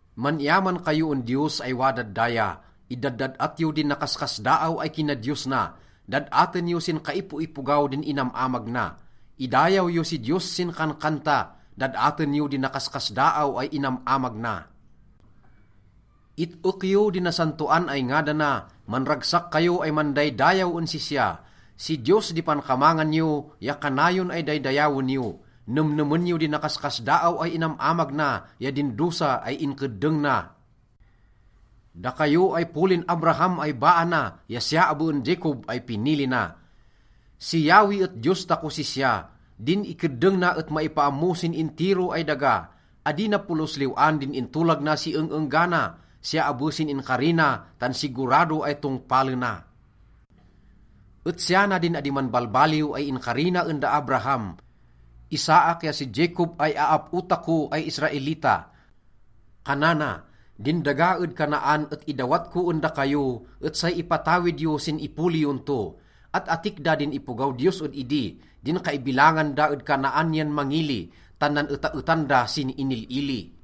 Man-iyaman kayo en Diyos ay wadad daya. Idaddad-at yo din nakaskasdaaw ay kinadiyos na, dad-aten yo sin kaipoipogaw din inam-amag na. Idayaw yo si Diyos sin kankanta, dad-aten yo din nakaskasdaaw ay inam-amag na. It-ek yo din nasantoan ay ngadana, manragsak kayo ay mandaydayaw en sisya. Si Diyos di pankamangan yo ya kanayon ay daydayawen yo. Nemnemen yo din nakaskasdaaw ay inam-amag na ya din dosa ay inkeddeng na, dakayo ay polin Abraham ay baa na ya siya abe en Jacob ay pinili na. Si Yahweh et Diyos takos sisya. Din ikeddeng na et maipaammo sin intiro ay daga. Adi na polos liw-an din intolag na si eng-enggana, siya abe sin inkari na, tan sigurado ay tongpalena. Et siya na din adi manbalbaliw ay inkari na en da Abraham, Isaac ya si Jacob ay aap-o tako ay Israelita. Kanana, “Din daga ed Canaan et idawat ko en dakayo, et say ipatawid yo sin ipoli yon to.” At-atik da din ipogaw Diyos ed idi, din kaibilangan da ed Canaan yan mangili, tan nan-etaetan da sin inil-ili.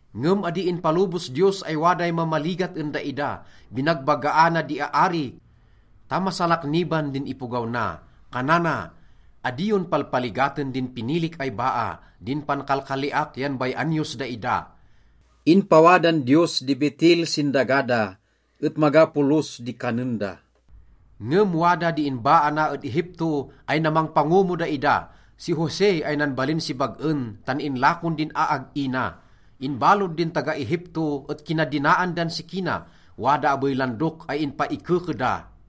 Ngem adi inpalobos Diyos ay waday mamaligat en daida. Binagbagaana di aari ta masalakniban din ipogaw na. Kanana, “Adi yon palpaligaten din pinilik ay baa, din pankalkaliak yan bay-an yos daida.” Inpawadan Diyos di betil sin daga da, et maga polos di kanen da. Ngem wada di inbaa na ed Egipto ay namangpango mo daida, si Jose ay nanbalin si bag-en tan inlakon din aag-i na. Inbalod din taga-Egipto et kinadinaan dan siki na, wada abey landok ay inpaikeke da,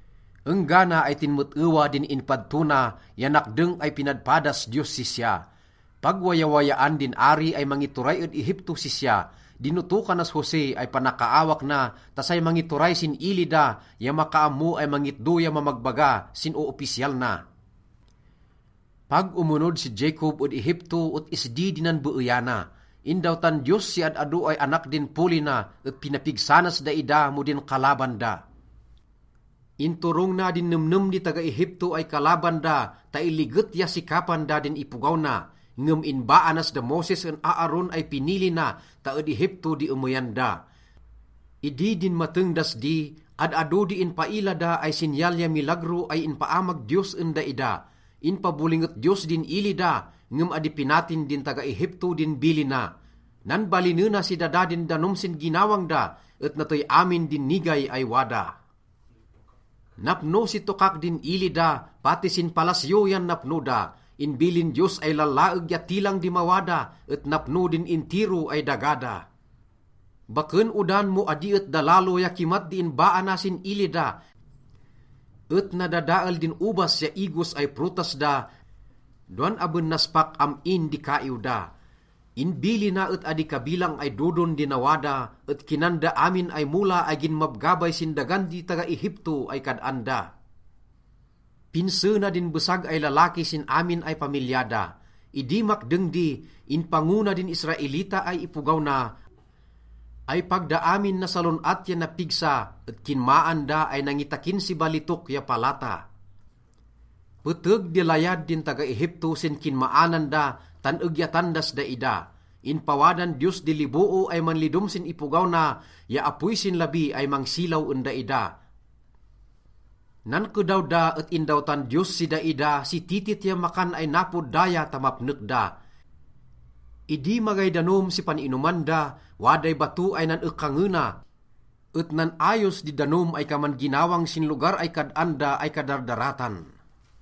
enggana ay tinmet-ewa din inpadto na ya nakdeng ay pinadpadas Diyos sisya. Pag wayawayaan din ari ay mangituray ed Egiptos sisya. Dinotokanas Jose ay panakaawak na ta say mangituray sin ili da ya makaammo ay mangitdo ya mamagbaga sin oopisyal na. Pag omonod si Jacob ed Egipto et isdi di nanbeeyana. Indawtan Diyos si ad-ado ay anak din poli na et pinapigsa nas daida mo din kalaban da. Inturong na din nemnem di taga-Egipto ay kalaban da ta iliget ya sikapan da din ipogaw na, ngem inbaa nas da Moses en Aaron ay pinili na ta ed Egipto di emeyan da. Idi dinmateng das di, ad-ado di inpaila da ay sinyal ya milagro ay inpaamag Diyos en daida. Inpabolinget Diyos din ili da, ngem adi pinatin din taga-Egipto din bilina. Nanbalinena si dada din danom sin ginawang da, et natey amin din nigay ay wada. Napno si tokak din ili da, pati sin palasyo yan napno da. Inbilin Diyos ay lallaeg ya tilang di mawada, et napno din intiro ay daga da. Baken odan mo adi et dalalo ya kimat di inbaa na sin ili da, et nadadael din obas ya igos ay prutas da dowan aben naspak am-in di kaiw da. Inbilina et adi kabilang ay dodon di nawada, et kinan da amin ay mola ay ginmabgabay sin dagan di taga-Egipto ay kad-an da. Pinse na din besag ay lalaki sin amin ay pamilya da. Idi makdeng di, inpango na din Israelita ay ipogaw na, ay pag da amin nasalon-at ya napigsa, et kinmaan da ay nangitakin si balitok ya palata. Peteg di layad din taga-Egipto sin kinmaanan da tan egyatan das daida. Inpawadan Diyos di liboo ay manlidom sin ipogaw na ya apoy sin labi ay mangsilaw en daida. Nankedaw da et indawtan Diyos si daida si titit ya makan ay napod daya ta mapnek da. Idi magay danom si pan-inoman da, waday bato ay nan-ekangena, et nan-ayos di danom ay kaman ginawang sin lugar ay kad-an da ay kadardaratan.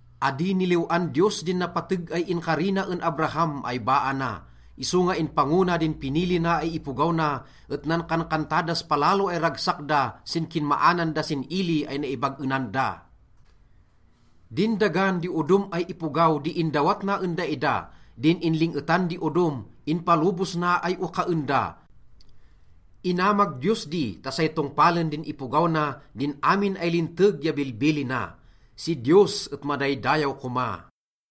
Adi niliw-an Diyos din napateg ay inkari na en Abraham ay baa na. Isonga inpango na din pinili na ay ipogaw na, et nankankanta das palalo ay ragsak da sin kinmaanan da sin ili ay naibag-enan da. Din dagan di odom ay ipogaw di indawat na en daida, din inling-etan di odom, inpalobos na ay okaen da. Inamag Diyos di ta say tongpalen din ipogaw na din amin ay linteg ya bilbilina. Si Diyos et madaydayaw koma!